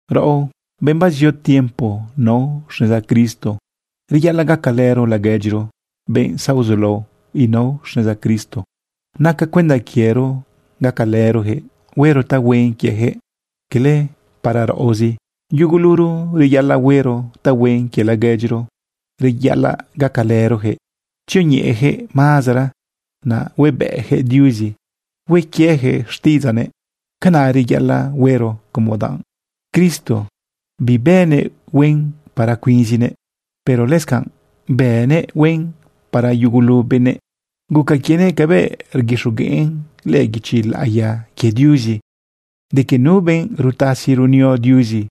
Raꞌo, benꞌ bazio tiempo nao xneza Cristo, reyaꞌalaꞌ gacalëro laguedyiro, benꞌ zaozulao inao xneza Cristo. Naca cuenda quiero gacalërojëꞌ huero tahuen quiejëꞌ, cala para raꞌozi. Yuguluro reyaꞌalaꞌ huero tahuen quie laguedyiro, reyaꞌalaꞌ gacalërojëꞌ tzioñeꞌeyaquëꞌ mazara, naꞌ huebëꞌjëꞌ Diuzi hue quiejëꞌ xtiꞌidzaꞌnëꞌ. Canaꞌ reyaꞌalaꞌ huero como danꞌ Cristo bibënëꞌ huen para cuinzinëꞌ, pero lëscanꞌ bënëꞌ huen para yugulu benëꞌ. Guca quienëꞌ cabëꞌ rguixogueꞌn lëꞌë guichi laꞌiya quie Diuzi de que nu benꞌ rutasi runio Diuzi,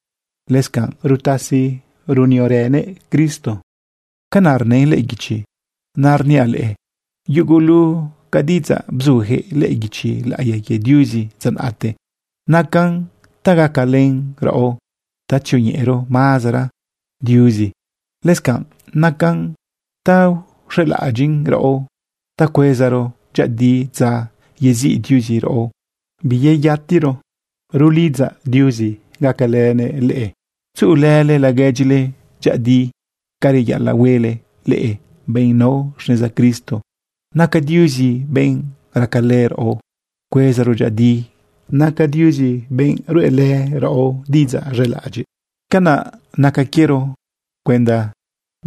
lëscanꞌ rutasi runiorënëꞌ Cristo. Canaꞌ rnën lëꞌë guichi. Naꞌ rniaꞌ leꞌe, yugulu ca diꞌidzaꞌ bzuyaquëꞌ lëꞌë guichi laꞌiya quie Diuzi dza naꞌte, nacan ta gacalën raꞌo ta tzioñeꞌero mazara Diuzi. Lëscanꞌ nacan ta uxelaꞌadyiꞌn raꞌo ta cuezaro dyëꞌëdi dza yeziꞌ Diuzi raꞌo biyeyatiro. Rulidzaꞌ Diuzi gacalënëꞌ leꞌe tzuꞌulële laguedyile dyëꞌëdi ca reyaꞌalaꞌhuele leꞌe, benꞌ nao xneza Cristo. Naca Diuzi benꞌ racalë raꞌo cuezaro dyëꞌëdi. Naca Diuzi benꞌ ruꞌelë raꞌo diꞌidzaꞌ z̃elaꞌadyiꞌ. Canaꞌ naca quiero cuenda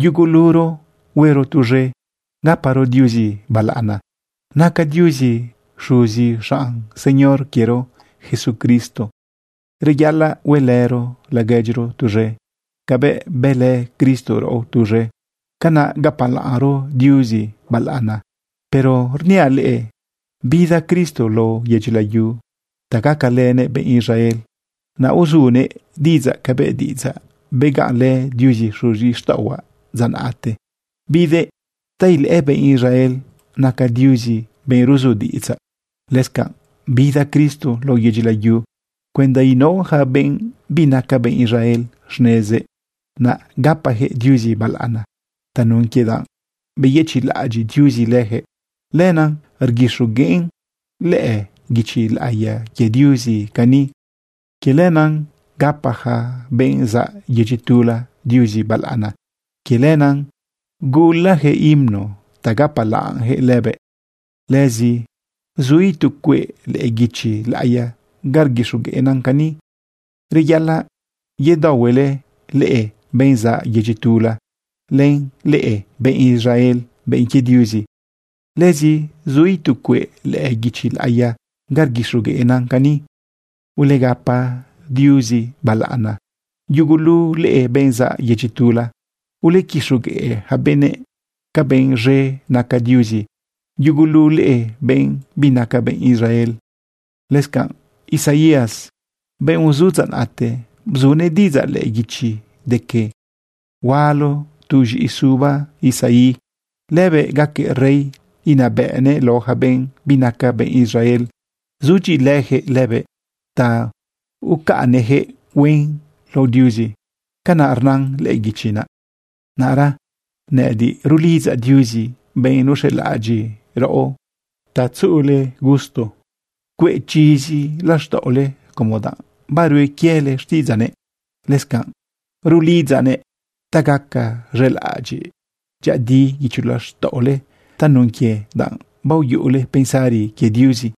yuguluro huero tuz̃e gaparo Diuzi balaꞌana. Naca Diuzi xuzi xanꞌ Señor quiero Jesucristo. Reyaꞌalaꞌ huelëro laguedyiro tuz̃e cabëꞌ bëlë Cristo raꞌo tuz̃e. Canaꞌ gapalaꞌnro Diuzi balaꞌana. Pero rniaꞌ leꞌe, bida Cristo lao yedyi layu ta gacalënëꞌ benꞌ Israel, naꞌ uzunëꞌ diꞌidzaꞌ cabëꞌ diꞌidzaꞌ begaꞌnlë Diuzi xuzixtaꞌohuaꞌ dza naꞌte. Bidëꞌ ta ilëꞌë benꞌ Israel naca Diuzi benꞌ ruzu diꞌidzaꞌ. Lëscanꞌ bida Cristo lao yedyi layu cuenda inao yaca benꞌ binaca benꞌ Israel xnezëꞌ, naꞌ gapajëꞌ Diuzi balaꞌana tanun quie danꞌ beyëchiꞌlaꞌadyiꞌ Diuzi leyaquëꞌ. Lenaꞌ rguixogueꞌn lëꞌë guichi laꞌiya quie Diuzi cani: Quie lenaꞌ gapa yaca benꞌ zaꞌ yedyi tula Diuzi balaꞌana. Quie lenaꞌ gulayaquëꞌ himno ta gapalaꞌnjëꞌ lëbëꞌ. Lëzi zu itu cueꞌ lëꞌë guichi laꞌiya ga rguixogueꞌnan cani: Reyaꞌalaꞌ yedaohuele leꞌe, benꞌ zaꞌ yedyi tula, len leꞌe, benꞌ Israel, benꞌ quie Diuzi. Lëzi zu itu cueꞌ lëꞌë guichi laꞌiya ga rguixogueꞌnan cani: Ulegapa Diuzi balaꞌana yugulu leꞌe, benꞌ zaꞌ yedyi tula. Ulequixogueꞌ yaca benëꞌ ca benꞌ z̃e naca Diuzi yugulu leꞌe, benꞌ binaca benꞌ Israel. Lëscanꞌ Isaías, benꞌ uzu dza naꞌte, bzunëꞌ diꞌidzaꞌ lëꞌë guichi de que: Hualo tu z̃iꞌi suba Isaí. Lëbëꞌ gaquëꞌ rey inabëꞌnëꞌ lao yaca benꞌ binaca benꞌ Israel. Sudyiꞌilëyaquëꞌ lëbëꞌ ta ucaꞌnnëꞌyaquëꞌ huen lao Diuzi. Canaꞌ rnan lëꞌë guichi naꞌ. Naꞌra nëꞌëdiꞌ rulidzaꞌ Diuzi, benꞌ nuxelaꞌadyiꞌ raꞌo, ta tzuꞌule gusto cueꞌ chizi laxtaꞌole como danꞌ barue quiele xtiꞌidzaꞌnëꞌ. Lëscanꞌ rulidzaꞌnëꞌ ta gaca z̃elaꞌadyiꞌ dyëꞌëdi guicho laxtaꞌole tanun quie danꞌ baoyuꞌule pensari quie Diuzi.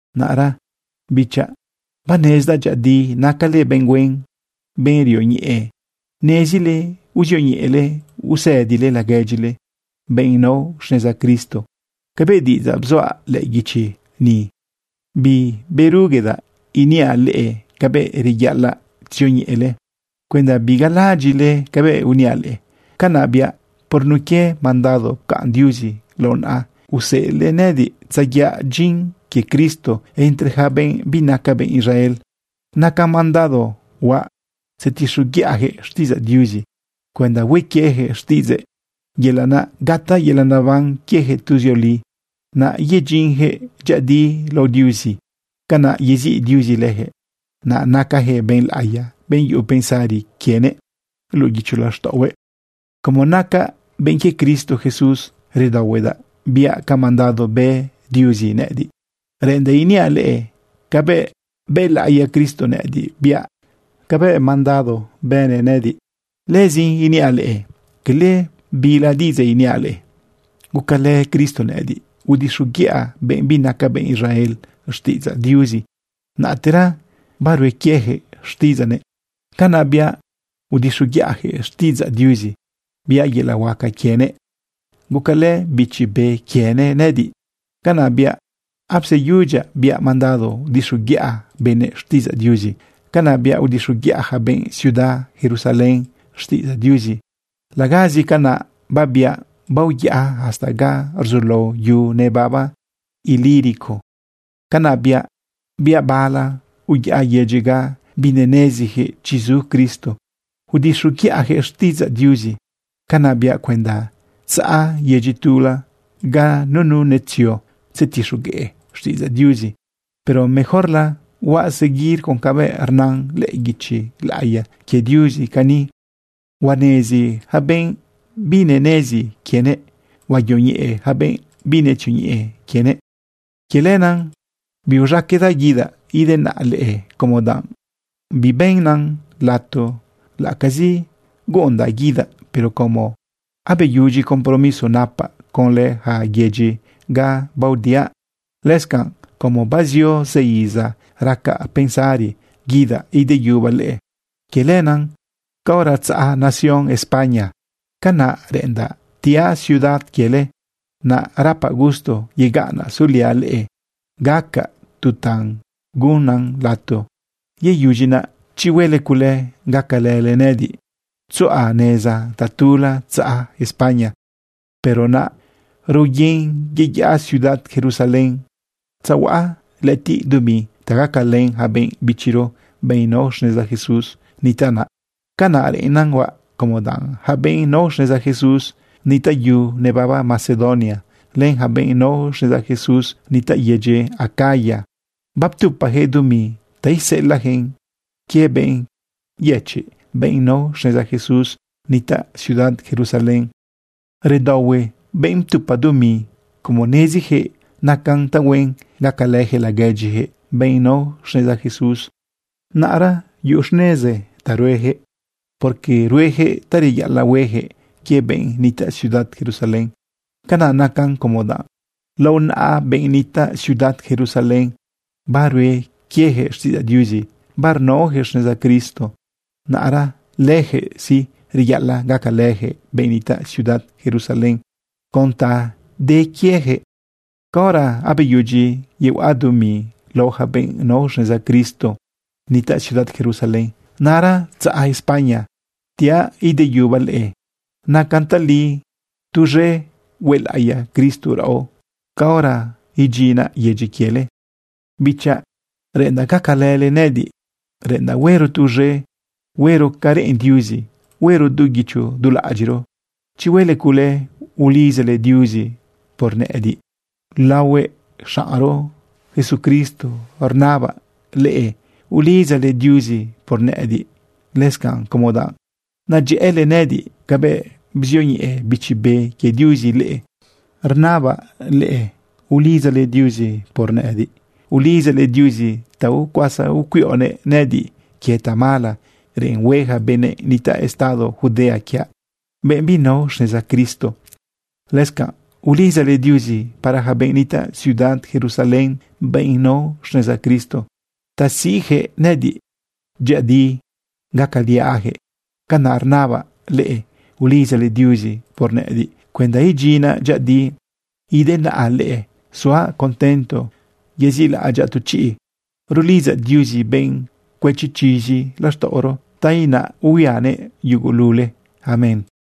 Naꞌra bichaꞌ, banezdaꞌ dyëꞌëdi nacale benꞌ huen, benꞌ rioñeꞌe. Nezile uzioñeꞌele usëdile laguedyile, benꞌ nao xneza Cristo. Cabëꞌ diꞌidzaꞌ bzuaꞌ lëꞌë guichi ni, biberuguedaꞌ iniaꞌ leꞌe cabëꞌ reyaꞌalaꞌ tzioñeꞌele cuenda bigalalaꞌadyiꞌle cabëꞌ uniaꞌ leꞌe. Canaꞌ biaꞌ por nun quie mandado pcaꞌn Diuzi lao naꞌa, useꞌelëꞌ nëꞌëdiꞌ tzayaꞌ dyin quie Cristo entre yaca benꞌ binaca benꞌ Israel. Nacan mandado huaꞌ tzetixoguiꞌajëꞌ xtiꞌidzaꞌ Diuzi cuenda hue quieyaquëꞌ xtiꞌidzëꞌ, yelaꞌ naꞌ gataꞌ yelaꞌ neban quiejëꞌ tuzioli, naꞌ yedyinyaquëꞌ dyëꞌëdi lao Diuzi. Canaꞌ yeziꞌ Diuzi lëjëꞌ, naꞌ nacajëꞌ benꞌ laꞌiya, benꞌ yuꞌu pensari quienëꞌ luꞌu guicho laxtaꞌohue. Como nacaꞌ benꞌ quie Cristo Jesús, redaohuedaꞌ biaꞌ ca mandado bë Diuzi nëꞌëdiꞌ. Reꞌendaꞌ iniaꞌ leꞌe cabëꞌ bëlaꞌiya Cristo nëꞌëdiꞌ biaꞌ cabëꞌ mandado bënëꞌ nëꞌëdiꞌ. Lëzin iniaꞌ leꞌe cala bila diꞌidzaꞌ iniaꞌ leꞌe. Gucalë Cristo nëꞌëdiꞌ udixoguiꞌa benꞌ binaca benꞌ Israel xtiꞌidzaꞌ Diuzi, naꞌtera barue quieyaquëꞌ xtiꞌidzaꞌnëꞌ. Canaꞌ biaꞌ udixoguiꞌajëꞌ xtiꞌidzaꞌ Diuzi, biaꞌ yelaꞌ huaca quienëꞌ, gucalë Bichi Be quienëꞌ nëꞌëdiꞌ. Canaꞌ biaꞌ apseyudyaꞌ biaꞌ mandado udixoguiꞌa benëꞌ xtiꞌidzaꞌ Diuzi. Canaꞌ biaꞌ udixoguiꞌa yaca benꞌ ciudad Jerusalén xtiꞌidzaꞌ Diuzi. Lagazi canaꞌ babiaꞌ, baoyaꞌa hasta ga rzulao yu nebaba Ilírico. Canaꞌ biaꞌ, biaꞌ bala, uyaꞌa yedyi ga binenezijëꞌ chi zu Cristo udixoguiꞌajëꞌ xtiꞌidzaꞌ Diuzi. Canaꞌ biaꞌ cuenda tzaꞌa yedyi tula ga nunu netzio tzetixogueꞌ xtiꞌidzaꞌ Diuzi. Pero mejorla huaꞌ seguir con cabëꞌ rnan lëꞌë guichi laꞌiya quie Diuzi cani: Huanezi yaca benꞌ binenezi quienëꞌ. Huayoñeꞌe yaca benꞌ binetzioñeꞌe quienëꞌ. Quie lenaꞌ biuz̃aqueꞌdaꞌ guidaꞌ idenaꞌa leꞌe como danꞌ bibënan lato laꞌacazi guꞌundaꞌ guidaꞌ. Pero como abeyudyi compromiso napaꞌ conlë yaca yedyi ga baodiaꞌ, lëscanꞌ como bazio zë iza racaꞌ pensari guidaꞌ ideyubaꞌ leꞌe, quie lenaꞌ, caora tzaꞌa nación España, canaꞌ reꞌendaꞌ tiaꞌ ciudad quiele. Naꞌ rapaꞌ gusto yegaꞌnaꞌ suliaꞌ leꞌe gaꞌaca tu ta gunnan lato. Yeyudyi naꞌ, chi huele cule, gacalële nëꞌëdiꞌ tzuꞌa neza tatula tzaꞌa España. Pero naꞌa raoyen yeyaꞌa ciudad Jerusalén tzehuaꞌa lëꞌëtiꞌ dumi ta gacalën yaca benꞌ bichiro, benꞌ nao xneza Jesús nitaꞌ naꞌ. Canaꞌ reꞌennan huaꞌ, como danꞌ yaca benꞌ nao xneza Jesús nitaꞌ yu nebaba Macedonia, len yaca benꞌ nao xneza Jesús nitaꞌ yedyi Acaya, baptupajëꞌ dumi ta iseꞌelaꞌyaquëꞌn quie benꞌ yëchiꞌ, benꞌ nao xneza Jesús nitaꞌ ciudad Jerusalén. Redaohue benꞌ ptupa dumi como neziyaquëꞌ nacan tahuen gacalëjëꞌ laguedyijëꞌ, benꞌ nao xneza Jesús. Naꞌra yuꞌun xnezi ta ruejëꞌ, porque rueyaquëꞌ ta reyaꞌalaꞌ hueyaquëꞌ quie benꞌ nitaꞌ ciudad Jerusalén. Canaꞌ nacan, como danꞌ lao naꞌa benꞌ nitaꞌ ciudad Jerusalén barue quieyaquëꞌ xtiꞌidzaꞌ Diuzi barnaoyaquëꞌ xneza Cristo. Naꞌra lëjëꞌ sí, reyaꞌalaꞌ gacalëjëꞌ benꞌ nitaꞌ ciudad Jerusalén con ta de quieyaquëꞌ. Caora abeyudyi yehuaꞌa dumi lao yaca benꞌ nao xneza Cristo nitaꞌ ciudad Jerusalén, naꞌra tzaꞌa España tiaꞌ ideyubaꞌ leꞌe. Nacan tali tuz̃e huelaꞌiya Cristo raꞌo caora idyinaꞌ yedyi quiele. Bichaꞌ, reꞌendaꞌ gacalële nëꞌëdiꞌ. Reꞌ endaꞌ huero tuz̃e huero ca reꞌen Diuzi huero du guicho du laꞌadyiꞌro. Chi huele cule, ulidzale Diuzi por nëꞌëdiꞌ. Laohue xaꞌnro Jesucristo rnabaꞌ leꞌe ulidzale Diuzi por nëꞌëdiꞌ. Lëscanꞌ como danꞌ nadyëꞌële nëꞌëdiꞌ cabëꞌ bzioñeꞌe Bichi Be quie Diuzi leꞌe, rnabaꞌ leꞌe ulidzale Diuzi por nëꞌëdiꞌ. Ulidzale Diuzi ta ucuasa ucuiꞌonëꞌ nëꞌëdiꞌ quie tamala reꞌen hue yaca benꞌ nitaꞌ estado Judea quiaꞌ, benꞌ binao xneza Cristo. Lëscanꞌ ulidzale Diuzi para yaca benꞌ nitaꞌ ciudad Jerusalén, benꞌ nao xneza Cristo, ta siꞌyaquëꞌ nëꞌëdiꞌ dyëꞌëdi gacaliaꞌyaquëꞌ. Canaꞌ rnabaꞌ leꞌe ulidzale Diuzi por nëꞌëdiꞌ cuenda idyinaꞌ dyëꞌëdi idenaꞌa leꞌe suaꞌ contento yezilaꞌadyaꞌ tu chiꞌ. Rulidzaꞌ Diuzi, benꞌ cuëchi chizi laxtaꞌoro, ta inaꞌ ihuianëꞌ yugulule. Amén.